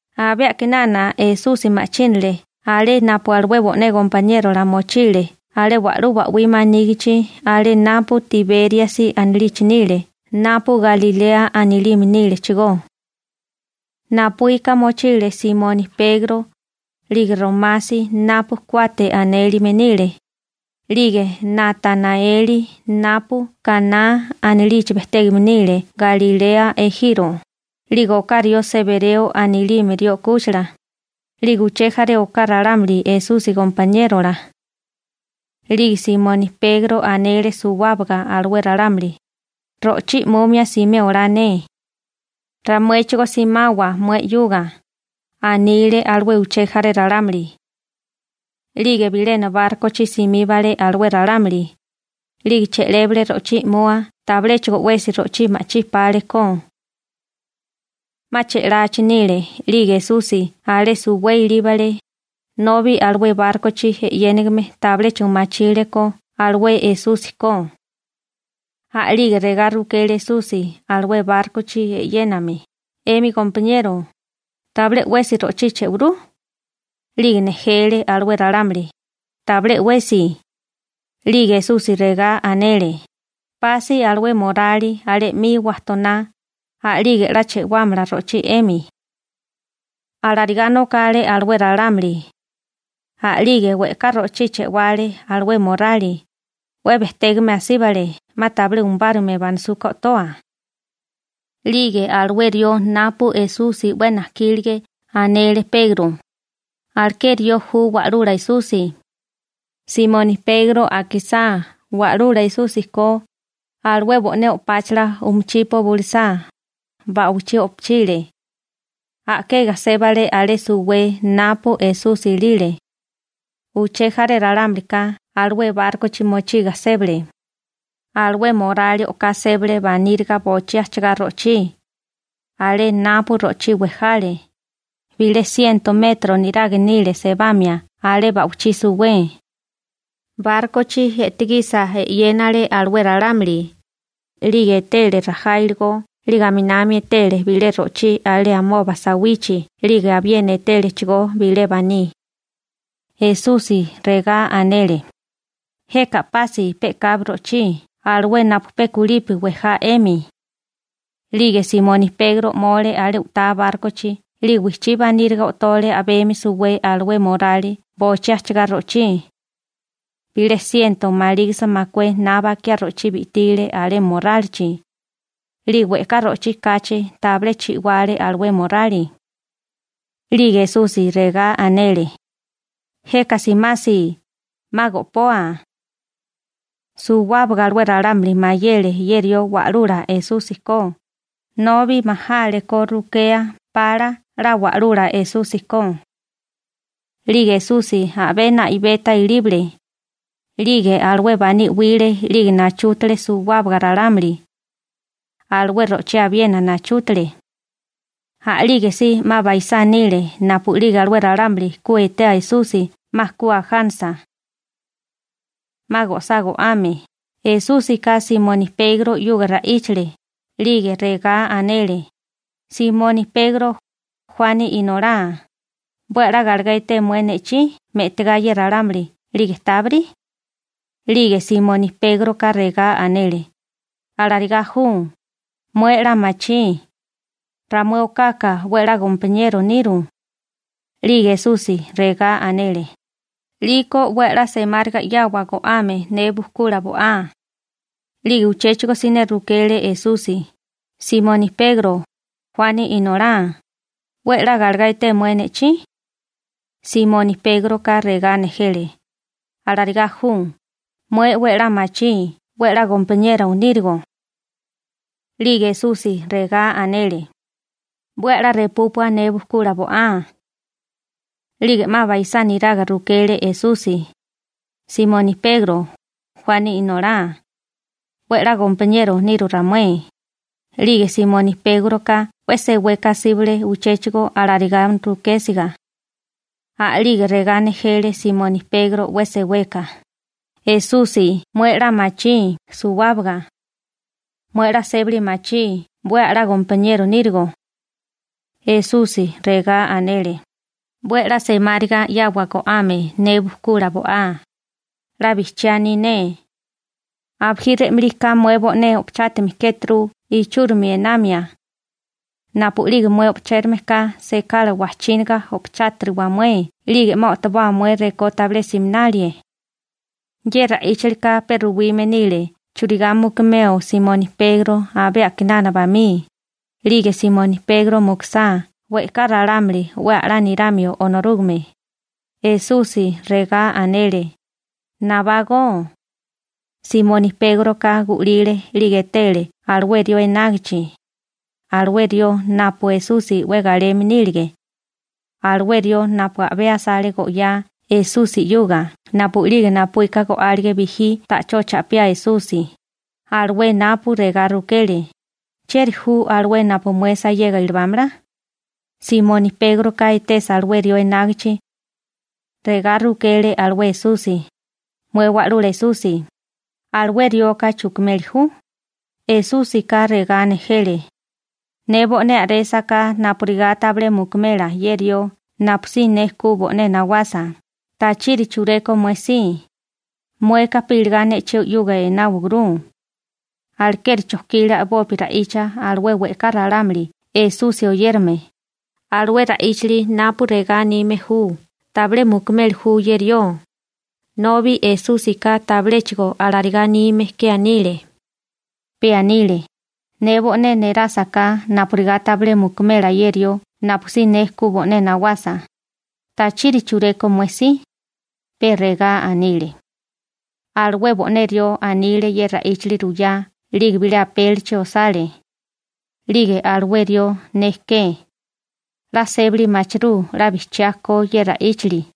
Abé a'kinana Esusi ma'chínale alé napu alué bo'né gompaniérola mochile alé wa'lú ba'wí manígichi alé napu Tibériasi anilichi nile napu Galilea anilime nílechigó. Napuíka mochile Simoni Pegro, 'lige Romasi napu «Kuate» anélime nile, 'lige Natanaeli napu Kaná anilichi bejtégame nile Galilea ejiro, 'lige oká rió Sebereo anilime rió 'kúchila, 'lige uché jaré oká ralámuli Esusi gompaniérola. 'Lige Simoni Pegro anele suwábaga alué ralámuli: ―Ro'chí i'mumia simé olá ne. ―Ramuéchigó simawa mué 'yuga ―anile alué uché jaré ralámuli. 'Lige bilena bárkochi simíbale alué ralámuli, 'lige che'lébale ro'chí i'mua tabiléchigo 'wesi ro'chí ma'chí pale ko. 'Ma che'lachi nile 'lige Esusi alé suwé ilíbale, nobi alué bárkochi e'yéname tabiléchigo machile Esusi ko. A'lige regá rukele Esusi alué bárkochi e'yéname: ―'Emi gompaniero, ¿tabilé 'wesi ro'chí boinaru? 'Lige nejele alué ralámuli: ―Tabilé 'wesi. 'Lige Esusi regá anele: ―Pasi alué morali alé 'mi wajtoná, a'lige 'la boinámala ro'chí 'emi. Alarigá nokale alué ralámuli, a'lige we'ká ro'chí buyánale alué morálite, 'we bejtégame asíbale 'ma tabilé umébale banisúká o'toa. 'Lige alué rió napu Esusi 'we najkílige anele Pegro: ―¡Alué rió ju Wa'lula Esusi! Simoni Pegro akisá Wa'lula ko Esusi, alué bo'né o'páchala umuchipo bulisá, ba'wichí o'pochile. A'kega sébale alé suwé napu Esusi ilile. Uché jaré ralámulika alué bárkochi mochiga sébale, alué morali o'ká sébale baníriga bochí ajchagá ro'chí. Alé napu ro'chí wejale, bilé siento metro niraga nile sebamia alé ba'wichí suwé. Bárkochi e'tigisa 'yénale alué ralámuli, 'lige etele rajá iligó 'lige aminami etele bilé ro'chí alé amoba sawichi bo'ígame 'lige abiena etélechigó bilé baní. Esusi regá anele: ―Jeka a'pasi pe'kabi ro'chí alué napu pe kulipi wejá 'emi. 'Lige Simoni Pegro 'mole alé u'tá bárkochi 'lige wijchí baníriga o'tole a'bemi suwé alué morali bochí ajchigá ro'chí. Bilé siento malígisa makué na bakiá ro'chí bi'tile alé morálichi. 'La we'ká ro'chí kachi tabilé chi'wale alué morali. 'Lige Esusi regá anele: ―Jeka simasi, 'ma go'poa. Suwábaga alué ralámuli mayele ye rió Wa'lula Esusi ko, nobi majale ko rukea pala 'la Wa'lula Esusi ko. 'Lige Esusi abé na'ibeta ilíbale, 'lige alué baní 'wile 'lige nachútale suwábaga ralámuli. Alué ro'chí abiena nachútale. A'lígesí 'ma baisá nile napu'lige alué ralámuli ku etea Esusi 'ma ku ajánasa. 'Ma go'sá go'ame, Esúsika Simoni Pegro 'yuga ra'íchale, 'lige regá anele: ―Simoni Pegro, Juani inolá, ¿'we a'lá galegá eté mué ne'chí me'tigá ye ralámuli 'lige tábiri? 'Lige Simoni Pégroka regá anele: ―Alarigá ju. Mué 'la machí, ramué okaka 'we a'lá gompaniero niru. 'Lige Esusi regá anele: ―'Liko 'we a'lá semáriga 'yawa go'ame ne bujkula bo'á. 'Lige uchéchigo siné rukele Esusi: ―Simoni Pegro, Juani inolá, ¿'we 'la galegá eté mué ne'chí? Simoni Pégroka regá nejele: ―Alarigá ju, mué 'we a'lá machí 'we a'lá gompaniero nírigo. 'Lige Esusi regá anele: ―'We a'lá repúpua ne bukula bo'á. 'Lige 'ma baisá niraga rukele Esusi: ―Simoni Pegro, Juani inolá, ¿'we a'lá gompaniero niru ramué? 'Lige Simoni Pégroka 'we seweka asíbale uchéchigo alarigá rukésiga. A'lige regá nejele Simoni Pegro 'we seweka: ―Esusi mué 'la machí suwábaga. Mué 'la sébali machí 'we a'lá gompaniero nírigo. Esusi regá anele: ―'We a'lá semáriga 'yawa go'ame ne bukula bo'á. 'La bijchiá aní ne. Abijí re'malí ka mué bo'né o'pochátime kéturu ichúrimi einamia, napu'lige mué o'chérame ka sekala wajchínaga o'pochátiriwa mué 'lige 'ma o'toboa mué rekó tabilé siminalie. Ye ra'íchalika pe ruwime nile churigá mukumeo Simoni Pegro abé a'kinana bamí, 'lige Simoni Pegro mukusá we'ká ralámuli 'we a'lá niramio Onorúgame. Esusi regá anele: ―¡Nabágó! Simoni Pégroka gu'lile 'lige etele alué rió enágichi, alué rió napu Esusi 'we galeme nílige, alué rió napu a'bé asale go'yá Esusi 'yuga napu'lige napuíka go'álige bijí ta'chó cha'piá Esusi, alué napu regá rukele: «¿Chieri ju alué napu mué sayega ilibámala?» Simoni Pégroka etesa alué rió enágichi, regá rukele alué Esusi: ―Mué Wa'lula Esusi, ¿alué rioka chukimeli ju? Esúsika regá nejele: ―Ne bo'né a'résaká napurigá tabilé mukumela ye rió napusí ne ku bo'né nawasa, ¿tachiri chureko mué si? Mueka pe iligá ne'chí 'yuga enáwaguru. Alekeri chojkile a'bopi ra'icha alué we'ká ralámuli Esusi oyérame, alué ra'íchali napu regá anime ju «tabilé mukumeli ju ye rió», nobi Esúsika tabiléchigo alarigá anime ke anile. Pe anile: «Ne bo'né nerásaká napurigá tabilé mukumela ye rió napusí ne ku bo'né nawasa, ¿tachiri chureko mué si?» pe regá anile. Alué bo'né rió anile ye ra'íchili ruyá 'lige bilé apélichi osale. 'Lige alué rió ne ke. 'La sébali machirú 'la bijchiá ko ye ra'íchali.